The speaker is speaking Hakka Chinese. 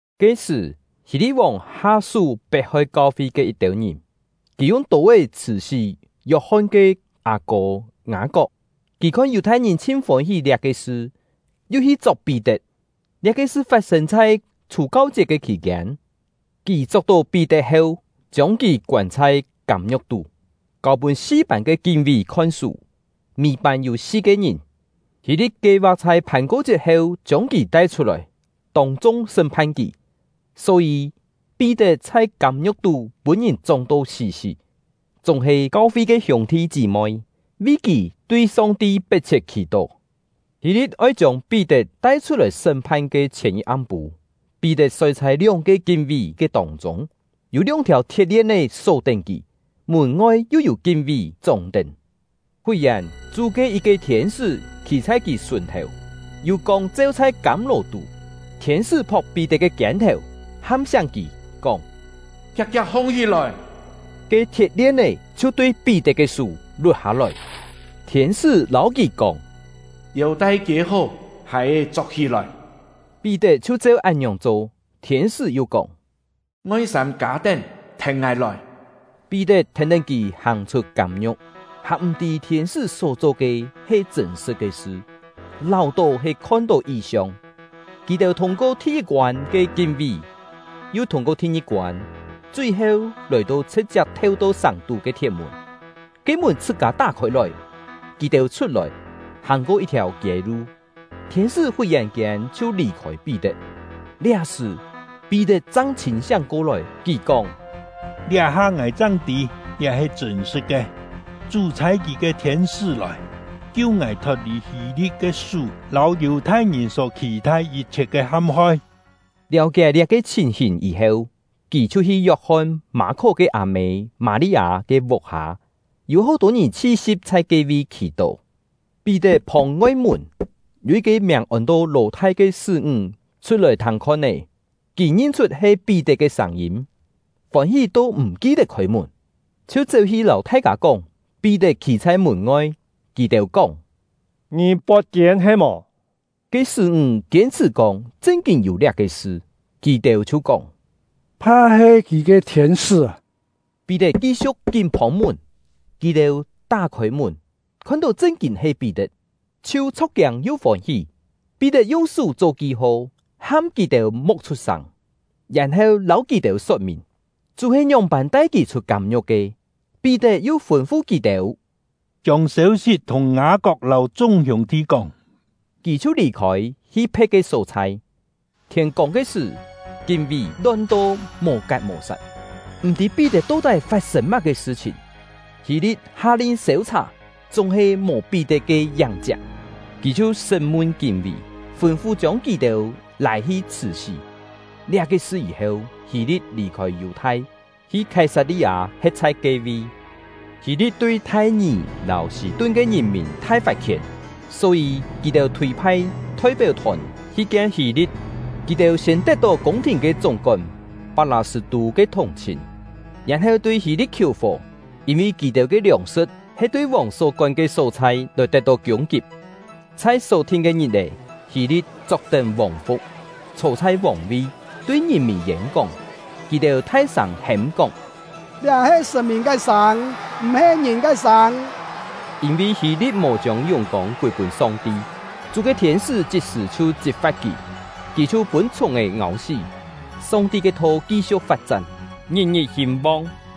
Ke-sṳ̀, Hî-li̍t-vòng ha-sú pet-hoi kau-fi ke yit-têu ngìn. Kì yung tô-é chhṳ̀-sí Yok-hon ke â-kô Ngâ-kok. Kì khon Yù-thai-ngìn chhin fôn-hí liá-ke sṳ, yu hi chok Pí-tet. (Liá-ke sṳ fat-sên chhai Chhù-kau-chiet ke khì-kiên.) Kì chok-tó Pí-tet heu, chiông kì koân chhai kâm-ngiu̍k tú, kâu-pûn si-pân ke kín-ví khon-sú, mî-pân yû si-ke ngìn. Hî-li̍t kie-va̍k chhai Phàn-ko-chiet heu chiông kì tai-chhut-lòi, tông-chung sṳ́m-phan kì. Só-yî, Pí-tet chhai kâm-ngiu̍k tú pûn-ngìn chóng-to sí-sí; chúng-he, kau-fi ke hiûng-thi chí-moi vi kì tui Song-ti pet-chhiet khì-tó. Hî-li̍t oi chiông Pí-tet tai-chhut-lòi sṳ́m-phan ke chhièn yit am-pû, Pí-tet soi chhai lióng-ke kín-ví ke tông-chûng, yû lióng-thiàu thiet-lien-é só-tén kì, mùn-ngoi yu yû kín-ví chóng-tén. Fut-yèn, Chú ke yit-ke thiên-sṳ́ khî chhai kì sùn-thèu, yû kông cheu chhai kâm-lò-tú. Thiên-sṳ́ phok Pí-tet ke kiên-thèu, ham-siáng kì, kóng: “Kiak-kiak hong-hí-lòi!” Ke thiet-lien-é chhiu tui Pí-tet ke sú lut-hâ-lòi. Thiên-sṳ́ lâu kì kóng: “Yêu-tai kiê-hó, hài-è chok-hí-lòi.” Pí-tet chhiu cheu án-ngiòng cho. Thiên-sṳ́ yu kóng: “Ngoi-sâm kâ-tén, thèn ngài lòi.” Pí-tet thèn-tén kì hàng-chhut kâm-ngiu̍k, hàn m̀-tî thiên-sṳ́ só-cho ke he chṳ̂n-sṳ̍t ke sṳ, láu-tó he khon-tó yi-siong. Kì-têu thûng-ko thi-yit-koân ke kín-ví, yu ko thi-ngi-koân, chui-heu, lòi-to chhṳ̍t-chiap theu-to sàng-tú ke thiet-mùn; ke mùn chhṳ-kâ tá khôi-lòi. Kì-têu chhut-lòi, hàng-ko yit-thiàu kiê-lu; thiên-sṳ́ fut-yèn-kiên chhiu lì-khôi Pí-tet. Liá-sṳ̀, Pí-tet chang chhîn-siáng ko-lòi; kì kóng: “Liá-ha ngài chang tî liá he chṳ̂n-sṳ̍t ke; Chú chhâi Kì ke thiên-sṳ́ lòi, kiu ngài thot-lì Hî-li̍t ke sú lâu Yù-thai-ngìn só khì-thai yit-chhiet ke ham-hoi.” Liáu-kié liá-ke chhìn-hìn yî-heu, kì chhiu hi Yok-hon-Mâ-khó ke â-mê Mâ-li-â ke vuk-hâ; yû hó-tô ngìn chhi-si̍p chhai ke-vi khì-tó. Pí-tet phông ngoi-mùn, yû yit-ke miàng ôn-to Lò-thai ke sṳ́-ńg chhut-lòi thâng khon-é. Kì ngin-chhut he Pí-tet ke sâng-yîm, fôn-hí to m̀ ki-tet khôi-mùn, chhiu chéu-hi lâu thai-kâ kóng Pí-tet khî chhai mùn-ngoi. Kì-têu kóng: “Ngì pot-tiên he-mò!” Ke sṳ́-ńg kiên-chhṳ̀ kóng chṳn-kîn yû liá-ke sṳ. Kì-têu chhiu kóng: “Pha he kì ke thiên-sṳ́!” Pí-tet ki-siu̍k kín phông-mùn. Kì-têu tá-khôi mùn, khon-tó chṳn-kîn he Pí-tet, chhiu chho̍k-kiâng yu fôn-hí. Pí-tet yung sú cho ki-ho, ham kì-têu mo̍k chhut-sâng, yèn-heu lâu kì-têu sot-mìn: Chú he ngióng-pân tai kì chhut kâm-ngiu̍k ke. Pí-tet yu fûn-fu kì-têu: “Chiông sêu-sit thùng Ngâ-kok lâu chung hiûng-thi kóng”; kì chhiu lì-khôi, hi phe̍t ke só-chhai. Thiên-kông ke sṳ̀, kín-ví lon-to mò-kat mò-sat, m̀ tî Pí-tet to-tái fat-sên má-ke sṳ-chhìn. Hî-li̍t ha-lin sêu-chhà, chúng-he mò Pí-tet ke yáng-chiak; kì chhiu sṳ́m-mun kín-ví, fûn-fu chiông kì-têu lâi-hi chhṳ̀-sí. Liá-ke sṳ yî-heu, Hî-li̍t lì-khôi Yù-thai, hi Khái-sat-li-â, he̍t chhai ke-vi. Hî-li̍t tui Thai-ngì lâu Sî-tun ke ngìn-mìn thai fat-khién; só-yî, kì-têu chhûi-phai thoi-péu-thòn hi kien Hî-li̍t. Kì-têu siên tet-tó kiûng-thìn ke chúng-kón Pak-lâ-sṳ̂-tû ke thùng-chhìn, yèn-heu tui Hî-li̍t khiù-fò, yîn-vi kì-têu ke liòng-sṳ̍t he tui vòng só kón ke só-chhai lòi tet-tó kiûng-kip. Chhai só-thin ke ngit-è, Hî-li̍t chok-tén vòng-fu̍k, chhô chhai vòng-vi, tui ngìn-mìn yên-kóng. Kì-têu thai-sâng hêm-kóng: “Liá he sṳ̀n-mìn ke sâng, m̀-he ngìn ke sâng!” Yîn-vi Hî-li̍t mò chiông yùng-kông kûi-pûn Song-ti, Chú ke thiên-sṳ́ chit-sṳ̀ chhiu chit-fa̍t kì. Kì chhiu pûn chhùng-è ngâu-sí. Song-ti ke tho ki-siu̍k fat-chán, ngit-ngit hîn-vong.